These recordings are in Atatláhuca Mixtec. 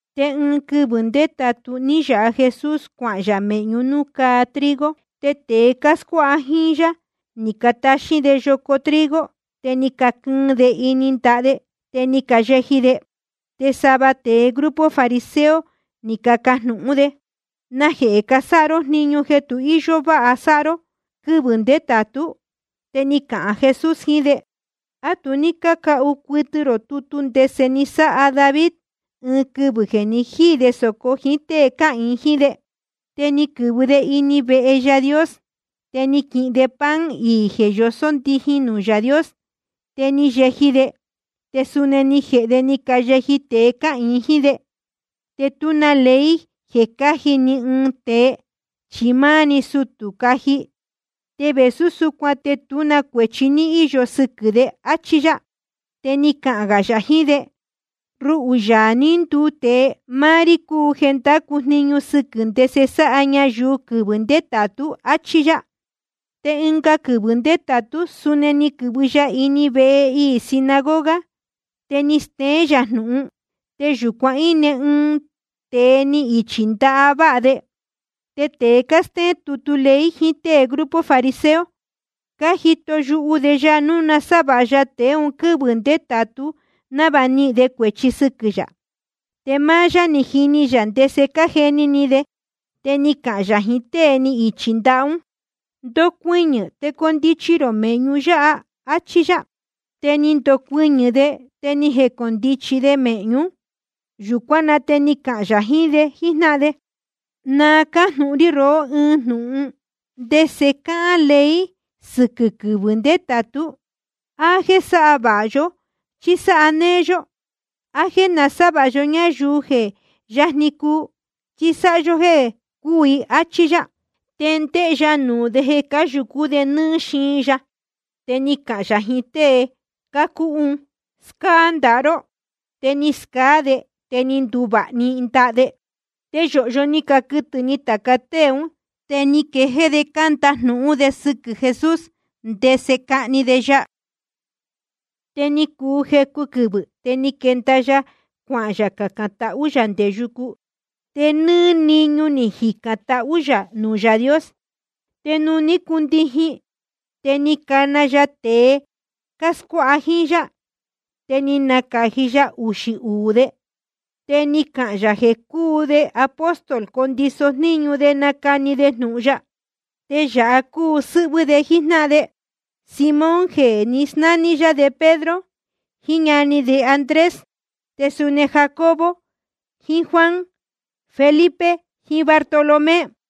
Te ɨɨn quɨvɨ̄ ndétātu ní yāha Jesús cuahān yā mēhñú nuū cáa trigo. Te tēe cáscuáha jíín yá ni cataxín de yoco trigo, te ni caquɨɨn de ini ndaha de, te ni cayeji de. Te sava tēe grupo fariseo ni cacajnūhún de: ¿Najehē casáha ró jniñu jeē tu íyó váha sáha ró quɨ́vɨ̄ ndétātú? Te ni cahān Jesús jiín de: ¿A tu ní cácahu cuɨtɨ rō tutu ndese ni sáha David, ɨɨn quɨvɨ̄ jeē ni jíī de sōco jíín tée cáhīin jíín de? Te ni quɨ̄vɨ de ini vehe Yaā Dios, te ni quihin de pan iī jeē yosó ndijin nuū Yaā Dios. Te ni yeji de, te suni ni jēhe de ni cayeji tēe cáhīin jíín de. Te tú na ley jeē cáji ni ɨɨn tēe, chi máá‑ni sutū cuu caji. Te vēsú súcuan te tú na cuēchi ní íyo sɨquɨ̄ de. Achí yá. Te ni cahān gā yā jiín de: Ruhū, Yaā ní nduu tēe, máá rí cúu jeē ndácu jniñu sɨquɨ̄ ndese sáha ñayuu quɨvɨ̄ ndétātú, áchí yá. Te ɨnga quɨvɨ̄ ndétātú, suni ni quɨ̄vɨ ya ini vehe iī sinagoga, te ni steén yā jnūhun. Te yūcuan íne ɨɨn tēe ni ichī ndaha váha de. Te tēe cástéén tutu ley jiín tée grupo fariseo, cájito yuhu de ya núu nasávāha ya tēe un quɨ́vɨ̄ ndétātú, návāha nihīn de cuēchi sɨquɨ̄ yā. Te máá yá je jíní yā ndese cájeni ni de. Te ni cahān yā jiín tée ni ichī ndaha ún: Ndocuɨñɨ̄, te condichi rō mēhñu yáha, áchí yá. Te ni ndocuɨñɨ̄ de, te ni jecondichi de mēhñú. Yūcuán na te ni cahān yā jiín de jíjnáhan de: Na cájnūhun rí rohó ɨɨn jnūhun: ¿Ndese cáhán ley sɨquɨ̄ quɨvɨ̄ ndétātú? ¿A jéē sáha vāha yó, chí sáha néé yó? ¿A jéē nasávāha yó ñáyuu je yajni cuu, chí sáha yó jéē cúū i? Achí yá. Te ndéhé yá nuū de jeē cáyūcú de nɨ́ɨ́ xiin ya. Te ni cahān yā jiín tée cúhú un: Scáá ndaha ró. Te ni scaá de, te ni nduvāha‑ni ndaha de. Te yōhyo ni caquɨtɨ̄ ni tāca tée un, te ni quejéé de cándajnūhún de sɨquɨ̄ Jesús, ndese cahni de ya. Te ni cuu jecu quɨvɨ̄, te ni quenda ya cuacacān tahú yā nde yucu. Te nɨ́ɨ́ niñu ni jicān tahú yā nuū Yaā Dios. Te nuū ní cundijin, te ni cana ya tāca tée cáscuáha jíín yá. Te ni nacāji ya uxī uū de, te ni cahān yā jeē cuu de apóstol, condiso jníñu de nacani de jnūhun ya. Te yāha cúu sɨ́hvɨ́ de jíjnáhan de: Simón jeē ní nasnání yá de Pedro, jiín ñani de Andrés, te suni Jacobo jiín Juan, Felipe jiín Bartolomé,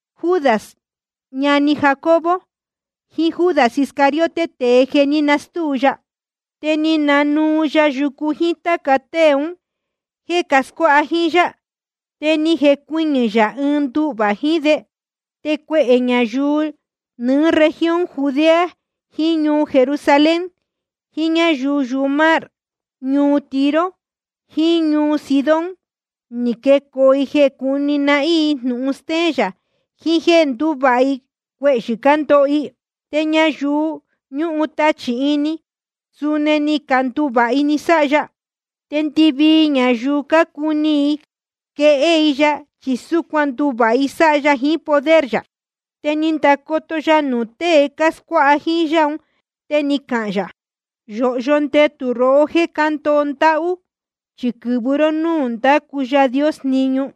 Judas ñani Jacobo, jiín Judas Iscariote, tēe jeē ní nastúu de ya. Te ni nanuu ya yucu jíín táca tée un jéē cascuáha jíín yá, te ni jecuɨñɨ̄ yā ɨɨn nduhvā jiín de. Te cuehē ñayuu nɨɨ́ región Judea jiín ñuu Jerusalén, jiín ñáyuu yumar ñuu Tiro jiín ñuu Sidón, ni quecoo i jeē cúni nahín i jnūhun stéén yā, jiín jéē ndúvāha i cuehyɨ̄ cándoho i. Te ñayuu jeē ñúhun tachī ini i, suni ni canduvāha i ni sáha ya. Te ndɨvii ñayuu cácuni i quehé i ya, chi súcuan ndúvāha i sáha ya jiín poder yā. Te ni ndacoto ya nuū tée cáscuáha jíín yá un, te ni cahān yā: Yōhyo ndetū rohó jéē cándoho ndáhú, chi quɨ̄vɨ ró ñuu nuū ndácu Yaā Dios jniñu.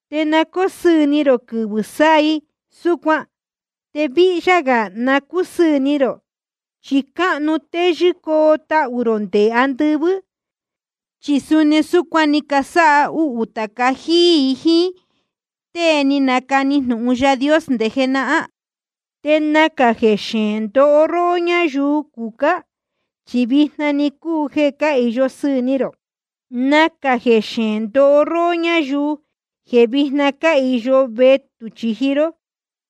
Te na cóo sɨɨ̄ ni rō quɨvɨ̄ sáha i súcuan, te víhyá gā na cúsɨɨ̄ ni rō, chi cáhnu téyɨ́ coo tahū rō nde andɨvɨ́. Chi suni súcuan ni casáha uhū tāca jíí i jíín tée ni canacani jnūhun Yaā Dios nde jenahán. ’Te nacā jeē xeēn ndoho róhó ñáyuu cucá, chi vijna‑ni cúu jeē cáhīyo sɨɨ̄ ni rō. ’Nacā jeē xeēn ndoho róhó ñáyuu jeē víjna cáhīyo vetū chīji ró,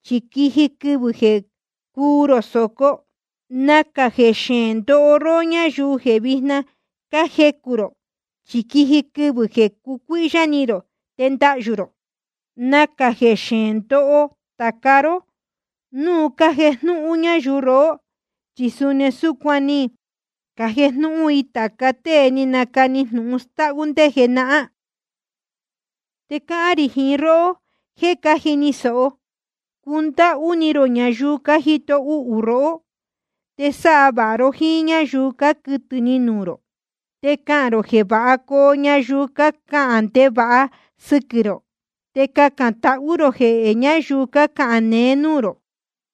chi quiji quɨvɨ̄ jeē cuu rō sōco. ’Nacā jeē xeēn ndoho róhó ñáyuu jeē víjna cájecū rō, chi quiji quɨvɨ̄ jeē nducuíhyá ni rō te ndahyū rō. ’Nacā jeē xeēn ndoho tāca ró núu cájejnúhún ñáyuu rohó, chi suni súcuan ni cajejnúhún jíí i tāca tée ni canacani jnūhun stáhú ndé jenahán. ’Te cáhán rī jiín róhó jeē cájini sōho: Cundáhú ni rō ñayuu cájito uhū rohó. Te sáha vāha ró jíín ñáyuu cáquɨtɨ̄ ni nuū rō. Te cacān rō jeē váha coo ñayuu cácahān ndevāha sɨ́quɨ̄ rō. Te cacān tahú rō jehē ñáyuu cácahān neé núū rō.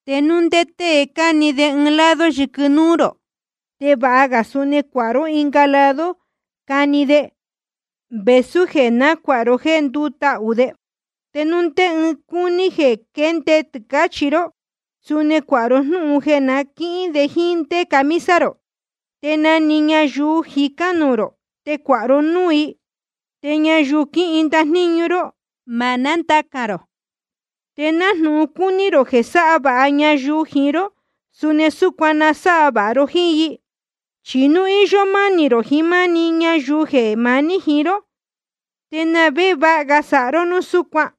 Te núu ndé tée cani de ɨɨn lado yɨquɨ núú rō, te vāha ga suni cuāha ró ɨnga lado cani de, vēsú jeē nácuāha ró jéē ndútahū de. Te núu ndé tée cúní de quende de tɨcāchi ró, suni cuāha ró jnúhun jeē na quíhín de jíín ndé camisa rō. Te na‑ni ñayuu jicán nuū rō, te cuāha ró núū i. Te ñayuu quíhin ndajníñu ró, ma nándacān rō. Te nájnūhun cácuni rō jeē sáha vāha ñayuu jiín ró, suni súcuan na sáha vāha ró jíín i. ’Chi núu íyó mánī rō jiín máá‑ni ñayuu jeē maní jiín ró, ¿te na vé jeē váha ga sáha ró núu súcuan?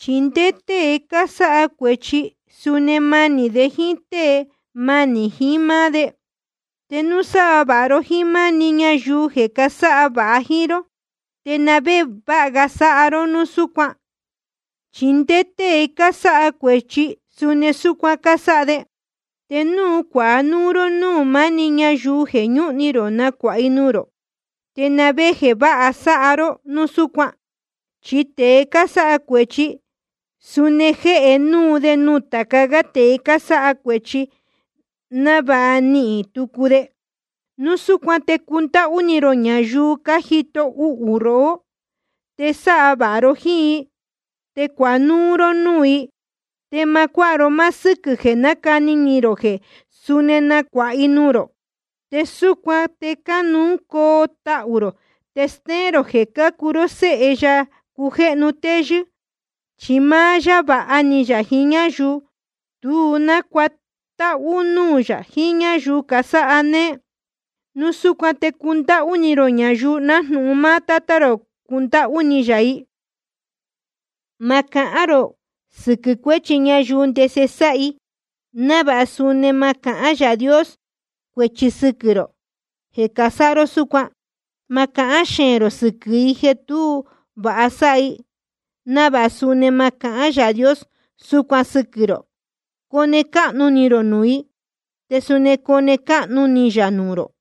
Chi nde tēe cásáha cuēchi, suni manī de jíín tée manī jiín máá de. Te núu sáha vāha ró jíín máá‑ni ñayuu jeē casáha vāha jíín ró, ¿te na vé jeē váha ga sáha ró núu súcuan? Chi nde tēe cásáha cuēchi, suni súcuan cásáha de. Te núu cuāha núú ró núū maá‑ni ñayuu jeē ñúhun ni rō nacuāha i nuū rō, ¿te na vé jeē váha ga sáha ró núu súcuan? Chi nde tēe cásáha cuēchi, suni jéhe núu de nuū tāca gá tēe cásáha cuēchi, návāha nanihīn tucu de. Núu súcuan te cundáhú ni rō ñayuu cájito uhū rohó, te sáha vāha ró jíín i, te cuāha núú ró núū i. Te ma cuáha ró máá sɨ́quɨ̄ jeē cani ni rō jeē suni nacuāha i nuū rō. Te súcuan te cáhnu coo tahū rō, te stéén rō jeē cácuu ró séhe Yaā cujéhnu téyɨ́. Chi máá yá vāha ni yā jiín ñáyuu tu nácuatáhú núū yā jiín ñáyuu casáha néé. Núu súcuan te cundáhú ni rō ñayuu, nájnūhun máá Tátá rō cúndáhú ni yā i. ’Ma cahán rō sɨquɨ̄ cuéchi ñayuu ndese sáha i, návāha suni ma cahán Yaā Dios cuēchi sɨquɨ̄ rō jeē casáha ró súcuan. Ma cahán xeēn rō sɨquɨ̄ i jeē tú vāha sáha i, návāha suni ma cahán Yaā Dios súcuan sɨquɨ̄ rō. Cone cáhnu ni rō nuū i, te suni cone cáhnu ni yā nuū rō.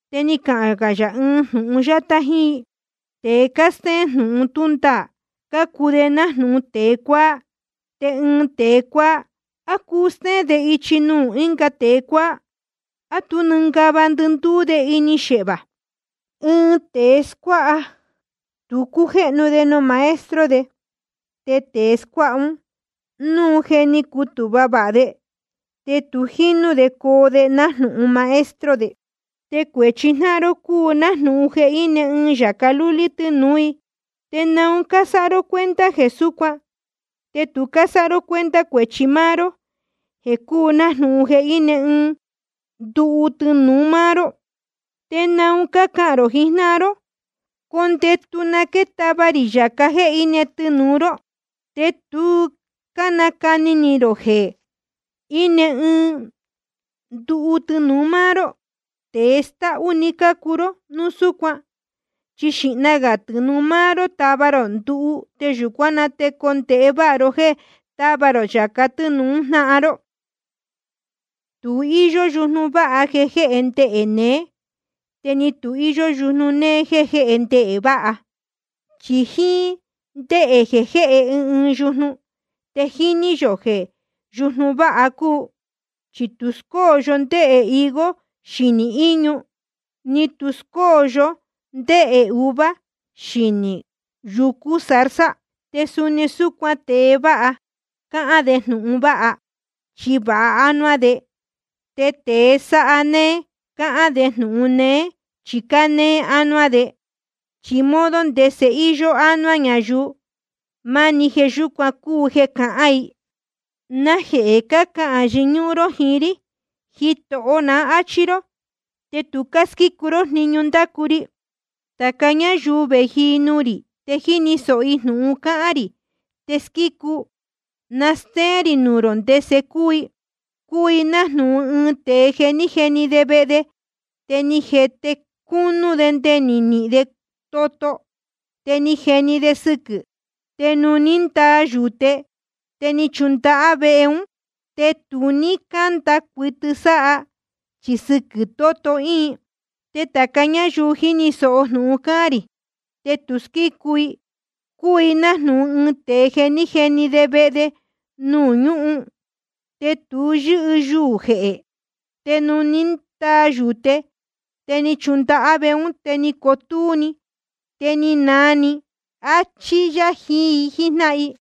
Te ni cahān yā ɨɨn jnūhun yátá jíín i: Tēe cástéén jnūhun tú ndaā, cácuu de nájnūhun tēe cuáá. Te ɨɨn tēe cuáá, ¿á cuu stéén de ichi nuū ɨnga tēe cuáá? ¿A tú nɨngava ndɨndúú de ini xehvā? Ɨɨn tēe scuáha, tu cújéhnu de nuū maestro de. Te tēe scuáha ún, núu je ni cutūhva vāha de, te jinū de coo de nájnūhun maestro de. ’Te cuēchi jnáhan ró cúu nájnūhun jeē íne ɨɨn yāca lúlí tɨnūú i. ¿Te naun cásáha ró cuenta jeē súcuan, te tu cásáha ró cuenta cuēchi máá ró jeē cúu nájnūhun jeē íne ɨɨn nduhu tɨnūu máá ró? ¿Te naun cácahān rō jiín jnáhan ró: Condetu, na táva rī yāca íne tɨnūu ró, te tu cánacani ni rō jeē íne ɨɨn nduhu tɨnūu máá ró? Tēe stáhú‑ni cácuu ró núu súcuan. Xīhna gā tɨnūu máá ró tava rō nduhu, te yūcuán na te cuu condēhe váha ró jéē táva rō yāca tɨ́nūu jnáhan ró. ’Tu íyó yujnu váha jeē jéhe ndehē neé, te ni tu íyó yujnu néé jéē jéhe ndehē váha. Chi jíín ndéhē jeē jéhe ɨɨn ɨɨn yujnu, te jíní yō núu yujnu váha cúu. Chi tu scóyo yó ndehē higo xinī íñu, ni tu scóyo yó ndehē uva xinī yucú zarza. Te suni súcuan tēe vāha, cáhán de jnūhun vāha, chi vāha ánuá de. Te tēe sáha néé cáhán de jnūhun néé, chi cánéé ánuá de. Chi modo ndese íyó ánuá ñayuu, máni jeē yúcuan cúu jeē cácahān i. ’¿Najehē cácahān yɨñúhún ró jiín rí: Jitoho ná, áchí ró, te tu cásquícu ró jniñu ndácu ri? Tāca ñáyuu vēji nuū rī te jíni sōho jnūhun cáhán rī te squícu, na stéén rī nuū rō ndese cúu i. Cúu i nájnūhun ɨɨn tēe jeē ní jeni de vehe de, te ni jete cúnú de nde ni nihīn de toto, te ni jeni de sɨquɨ̄. Te nuū ní ndaa yūte, te ni chundahá vehe ún, te tu ní cánda cuɨtɨ sáha, chi sɨquɨ̄ toto íin. Te tāca ñáyuu jíni sōho jnūhun cáhán rī, te tu squícu i, cúu i nájnūhun ɨɨn tēe ni jeni de vehe de nuū ñúhun, te tu yɨ́tuu jehē. Te nuū ní ndaa yūte, te ni chundahá vehe ún, te ni cotúú‑ni, te ni naa iī‑ni. Achí yá jiín i jíjnáhan i.